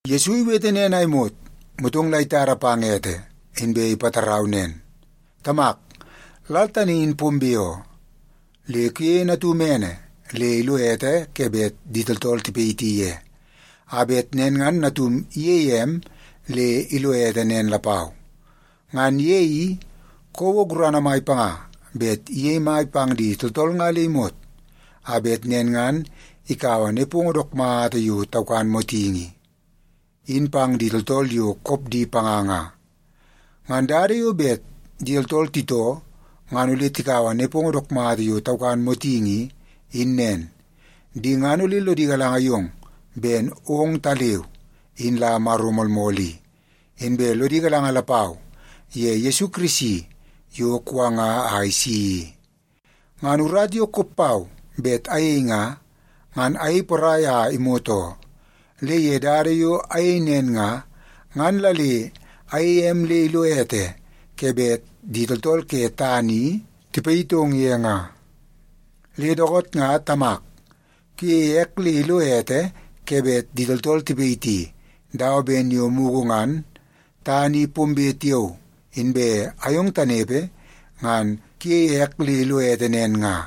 Yesu iwete nen a imot, motong la itada pang ete, inbe ipatarau nen, “Tamak, lal tani in pombe oo. Le kuyeie Natum ene le ilo ete ke bet di tooltool tipayiti ye, a bet nen ngan Natum iyeie em le ilo ete nen lapau. Ngan ye i, kouo gurana mai panga bet iyei mai pang di tooltool nga le imot, a bet nen ngan ikaua nepongo dook mata yo taukan motingi i, in pang di tooltool yo kop di panga nga. Ngan dada yo bet di tooltool titoo ngan ole tikaua nepongo dook mata yo taukan motingi i, in nen. Di ngan ole lodi galanga yong ben ongtaleu in la Maro moolmool i, inbe lodi galanga lapau ye Yesu Kirisi yo kuwanga a isi i. Ngan urata yo kop pau bet ayei nga, ngan ayei porai a imot oo. Le ye dada yo ayei nen nga, ngan la le ayeie em le ilo ete ke bet di tooltool ke tana i tipayitong ye nga. Le dookoot nga Tamak, kuyeie ek le ilo ete ke bet di tooltool tipayiti, dawa ben yo mugu ngan tana i pombe tiao inbe ayong tanepe ngan kuyei ek le ilo ete nen nga.”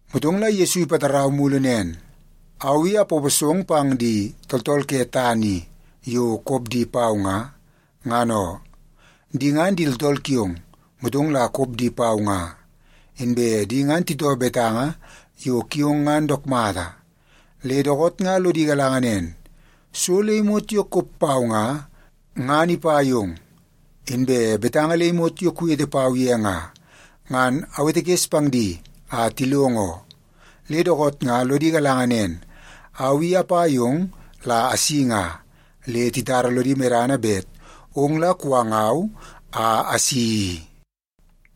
Motong la Yesu ipatarau mulu nen, “Au i apaposong pang di tooltool ke tana i yo kop di pau nga, ngan oo. Di ngan di tooltool kiong, motong la kop di pau nga. Inbe di ngan titoo betanga yo kiong ngan dook mata. Le dookoot nga lodi galanga nen, so le imot yo kop pau nga, ngan ipa yong. Inbe betanga le imot yo kuwete pau ye nga, ngan awetekes pang di a tilongo oo. Le dookoot nga lodi galanga nen, au i apa yong la asi nga, le titara lodi medana bet ong la kuwangau a asi i.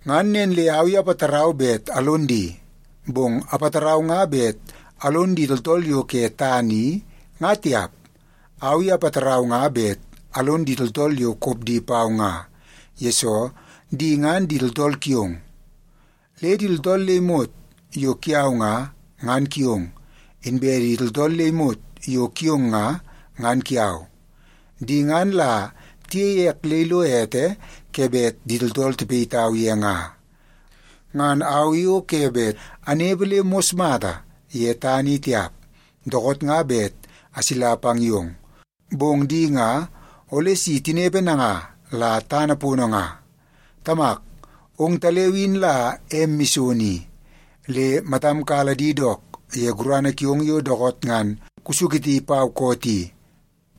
“Ngan nen le au i apatarau bet alon di. Bong apatarau nga bet alon di tooltool yo ke tana i, nga tiap. Au i apatarau nga bet alon di tooltool yo kop di pau nga, yesoo di ngan di tooltool kiong. Le di tooltool le imot yo kiau nga, ngan kiong, inbe di tooltool le imot yo kiong nga, ngan kiau. Di ngan la tiyeie ek le ilo ete ke bet di tooltool tipayitau ye nga. Ngan au i o ke bet anepe le mos mata ye tana i tiap, dookoot nga bet asila pang yong. Bong di nga ole si tinepe nanga la tana pono nga. Tamak, ongtaleu in la em mison i, le matam kala di dook ye gurana kiong yo dookoot ngan kusuketi pau koot i,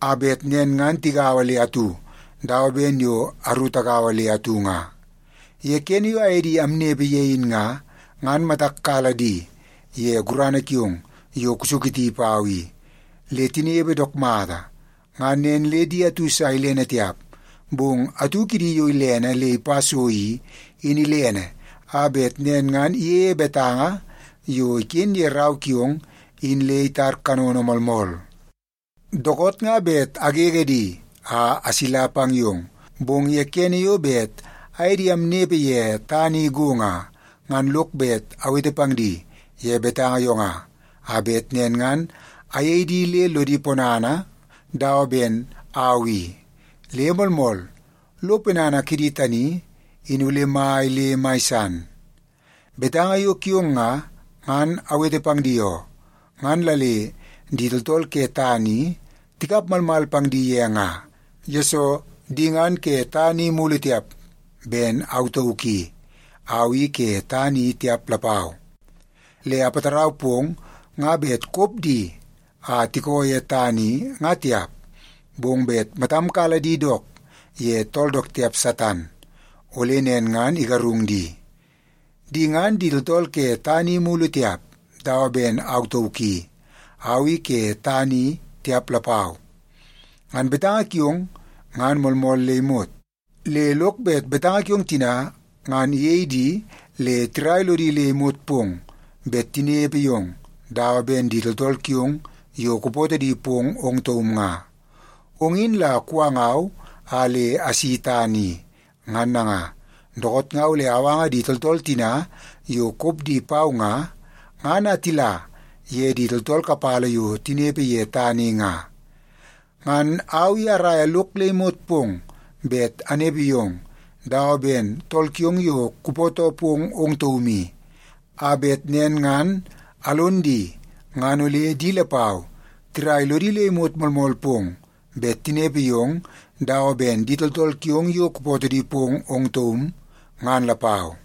a bet nen ngan tigaua le atu, dawa ben yo aru tagaua le atu nga. Ye kene yo aye di amnepe ye in nga, ngan matak kala di ye gurana kiong yo kusuketi pau i, le tinepe dook mata. Ngan nen le di atu sa ilene tiap, bong atu kidi yo ilene le ipa so i, in ilene a bet nen ngan iyeie betanga yo iken ye Rau kiong in le itar kanono moolmool. “Dookoot nga bet agege di a asila pang yong, bong ye kene yo bet aye di amnepe ye tana i go nga, ngan lok bet awete pang di ye betanga yo nga, a bet nen ngan ayei di le lodi ponana dawa ben au i. Le moolmool, lo ponana kidi tani in ole mai le mai san. Betanga yo kiong nga, ngan awete pang di oo. Ngan la le di tooltool ke tana i tikap malmal pang di ye nga, yesoo di ngan ke tana i mulu tiap, ben au tauk i, au i ke tana i tiap lapau. Le apatarau pong nga bet kop di a tikoo ye tana i, nga tiap, bong bet matam kala di dook ye tool dook tiap Satan, ole nen ngan igarung di. Di ngan di tooltool ke tana i mulu tiap, dawa ben au tauk i, au i ke tana i tiap lapau. Ngan betanga kiong ngan moolmool le imot, le lok bet betanga kiong tina ngan iyei di le tirai lodi le imot pong bet tinepe yong dawa ben di tooltool kiong yo kupootoo di pong ong taum nga. Ong in la kuwangau a le asi tana i. Ngan nanga, dookoot nga ole awanga di tooltool tina yo kop di pau nga, ngan a tila ye di tooltool kapala yo tinepe ye tana i nga. Ngan au i araia lok le imot pong bet anepe yong dawa ben tool kiong yo kupootoo pong ong taum i, a bet nen ngan alon di ngan ole di lapau tirai lodi le imot moolmool pong bet tinepe yong dawa ben di tooltool kiong yo kupootoo pong ong taum, ngan lapau.”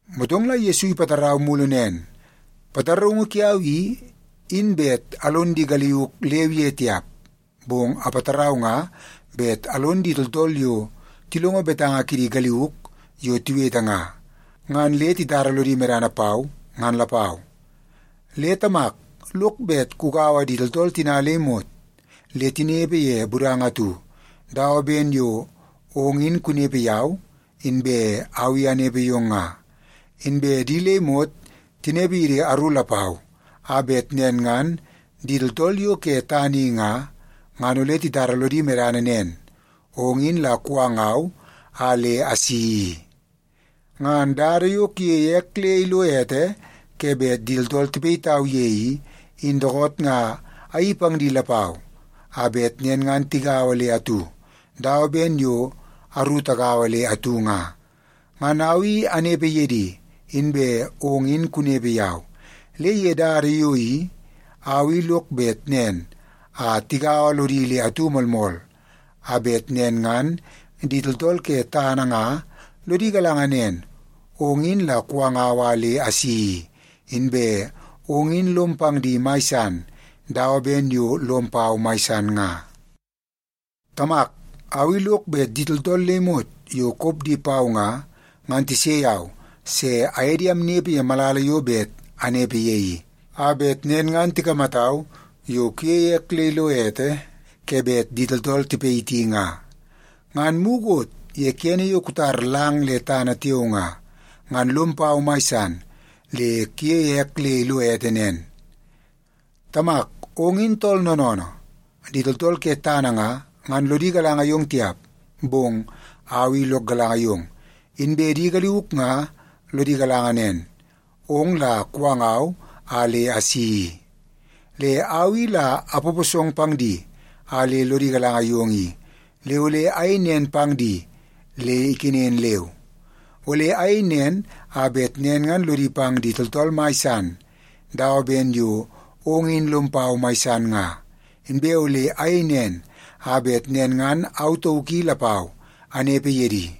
Motong la Yesu ipatarau mulu nen, “Pataraungu kiau i, in bet alon di galiuk leu ye tiap, bong apatarau nga bet alon di tooltool yo tilongo betanga kidi galiuk yo tiwete nga, ngan le titara lodi medana pau, ngan lapau. Le Tamak lok bet kugaua di tooltool tina le imot, le tinepe ye budanga atu, dawa ben yo ong in kunepe yau, inbe au i anepe yong nga. Inbe di le imot tinepe yidi aru lapau, a bet nen ngan di tooltool yo ke tana i nga, ngan ole titara lodi medana nen, ong in la kuwangau a le asi i. Ngan dada yo kuyeie ek le ilo ete ke bet di tooltool tipayitau ye i, in dookoot nga ayeii pang di lapau, a bet nen ngan tigaua le atu, dawa ben yo aru tagaua le atu nga. Ngan au i anepe ye di, inbe ong in kunepe yau. Le ye dada yo i, au i lok bet nen a tigaua lodi le atu moolmool, a bet nen ngan di tooltool ke tana nga lodi galanga nen, ong in la kuwangau a le asi i, inbe ong in lom pang di mai san dawa ben yo lom pau mai san nga. “Tamak, au i lok bet di tooltool le imot yo kop di pau nga, ngan tise yau se aye di amnepe ye malala yo bet anepe ye i, a bet nen ngan tikamatau yo kuyeie ek le ilo ete ke bet di tooltool tipayiti nga. Ngan mukot ye kene yo kutar lang le tana tiao nga, ngan lom pau mai san le kuyeie ek le ilo ete nen. “Tamak, ong in tool noonoonoo. Di tooltool ke tana nga, ngan lodi galanga yong tiap. Bong au i lok galanga yong, inbe di galiuk nga lodi galanga nen, ong la kuwangau a le asi i. Le au i la apaposong pang di a le lodi galanga yong i, le ole ayei nen pang di le ikenen leu. Ole ayei nen a bet nen ngan lodi pang di tooltool mai san dawa ben yo ong in lom pau mai san nga. Inbe ole ayei nen a bet nen ngan au tauk i lapau, anepe ye di.”